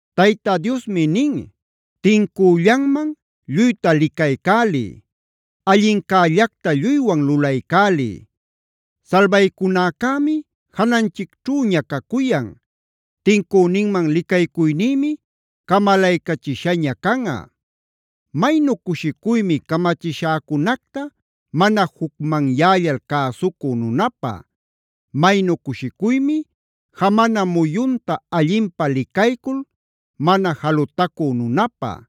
Tayta Diosmi nin: “Tincüllanman lluyta licaycäliy; allincällacta lluywan lulaycäliy. Salbaycunäcämi jananchicćhüña cacuyan; tincüninman licaycuynïmi camalaycachishaña canꞌa. Maynu cushicuymi camachishäcunacta mana jucmanyällal cäsucü nunäpä, maynu cushicuymi jamana muyunta allinpä licaycul mana jalutacü nunäpä,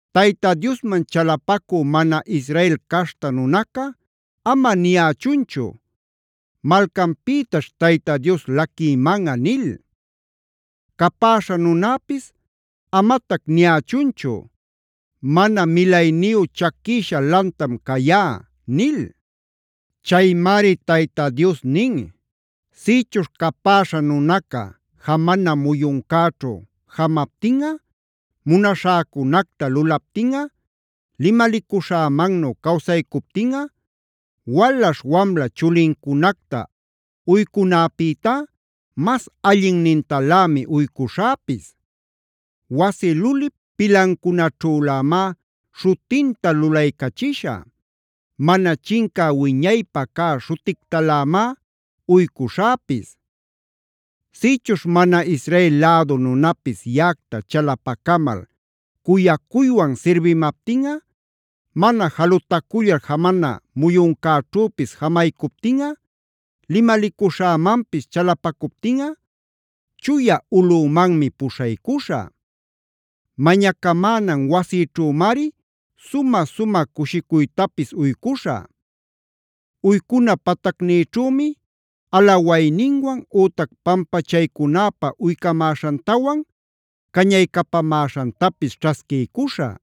“Tayta Diosman chalapacü mana Israel caśhta nunaca ama niyächunchu: ‘Malcanpïtaćh Tayta Dios laquïmanꞌa’ nil. Capäśha nunäpis amatac niyächunchu: ‘Mana milayniyu chaquïsha lantam cayá’” nil. Chaymari Tayta Dios nin: “Sïchuśh capäśha nunaca jamana muyuncäćhu jamaptinꞌa, munaśhäcunacta lulaptinꞌa, limalicuśhämannu cawsaycuptinꞌa, walaśh-wamla chulicunacta uycunäpïtá mas allinnintalämi uycuśhäpis. Wasi lulip pilancunaćhülämá śhutinta lulaycachishä; mana chincä wiñaypa cä śhutictalämá uycuśhäpis. “Sïchuśh mana Israel lädu nunapis yaꞌacta chalapacamal cuyaywan sirbimaptinꞌa, mana jalutacullal jamana muyuncäćhüpis jamaycuptinꞌa, limalicuśhämanpis chalapacuptinꞌa, chuya ulꞌümanmi puśhaycuśhä. Mañacamänan wasïćhümari sumä-sumä cushicuytapis uycuśhä. Uycuna patacnïćhümi alawayninwan ütac pampachaycunäpä uycamäśhantawan cañaycapamäśhantapis ćhasquiycuśhä.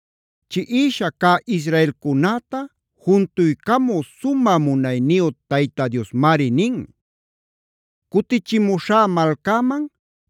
Chiꞌisha cä israelcunäta juntuycamü sumä munayniyu Tayta Diosmari nin: “Cutichimuśhá malcäman,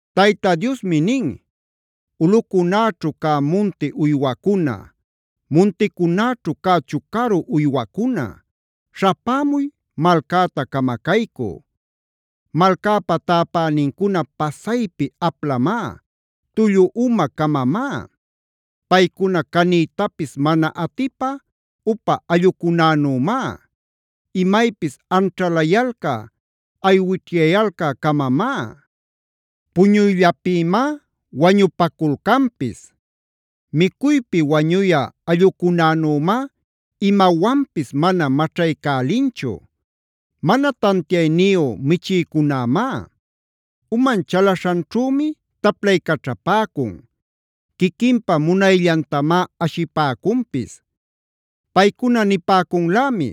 Tayta Diosmi nin: “Ulꞌucunäćhu cä munti uywacuna, munticunäćhu cä chucaru uywacuna, śhapämuy malcäta camacaycü. Malcäpa täpänincuna pasaypi aplamá, tullu uma-camamá. Paycuna caniytapis mana atipä upa allꞌucunänümá; imaypis anćhalayalcä aywićhyayalcä-camamá; puñuyllapïmá wañupaculcanpis. Micuypi wañuyä allꞌucunänümá imawanpis mana maćhaycälinchu. Mana tantiayniyu michïcunämá; uman chalaśhanćhümi taplaycaćhapäcun;d quiquinpä munayllantamá ashipäcunpis. Paycuna nipäcunlämi: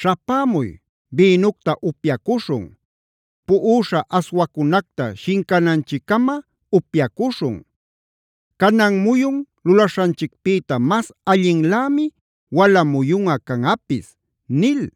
‘Śhapämuy; bïnucta upyacuśhun; puꞌuśha aswacunacta shincananchiccama upyacuśhun. Canan muyun lulaśhanchicpïta mas allinlämi wala muyunꞌa canꞌapis’” nil.